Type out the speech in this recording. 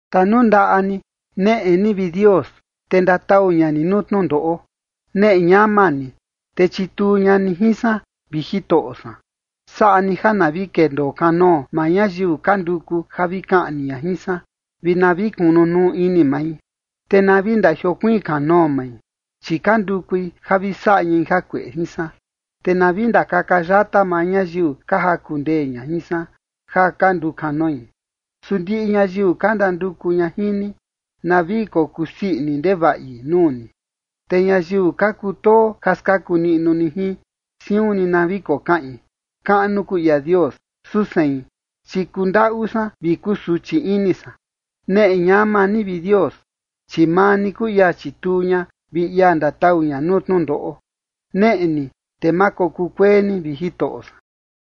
Tanundaꞌa ni neꞌe ni, vi Dios, te ndatau ña ni nuu tnundoꞌo. Neꞌe ñama ni, te chituu ña ni jin san, vi Jitoꞌo san. Saꞌa ni ja na vi kendoo kanoo maa ñayiu ka nduku ja vi kaꞌni ña jin san, vi na vi kunu nuu ini mai, te na vi ndajiokuiin kanoo mai, chi ka ndukui ja vi saꞌa ñai jakueꞌe jin san. Te na vi ndakaka yata maa ñayiu ka jaku ndee ña jin san, ja ka ndukanoi. Su ndiꞌi ñayiu ka ndanduku ña jin ni, na vi kokusii ini ndevaꞌi nuu ni. Te ñayiu ka kutoo ja skaku niꞌnu ni jin, siun ni na vi kokaꞌin: “Kaꞌnu kuu ia Dios”. Su sein, chi kundaꞌu san vi kusuchi ini san. Neꞌe ñama ni, vi Dios, chi maa ni kuu ia chituu ña vi ia ndatau ña nuu tnundoꞌo. Neꞌe ni te ma kokukuee ni, vi Jitoꞌo san.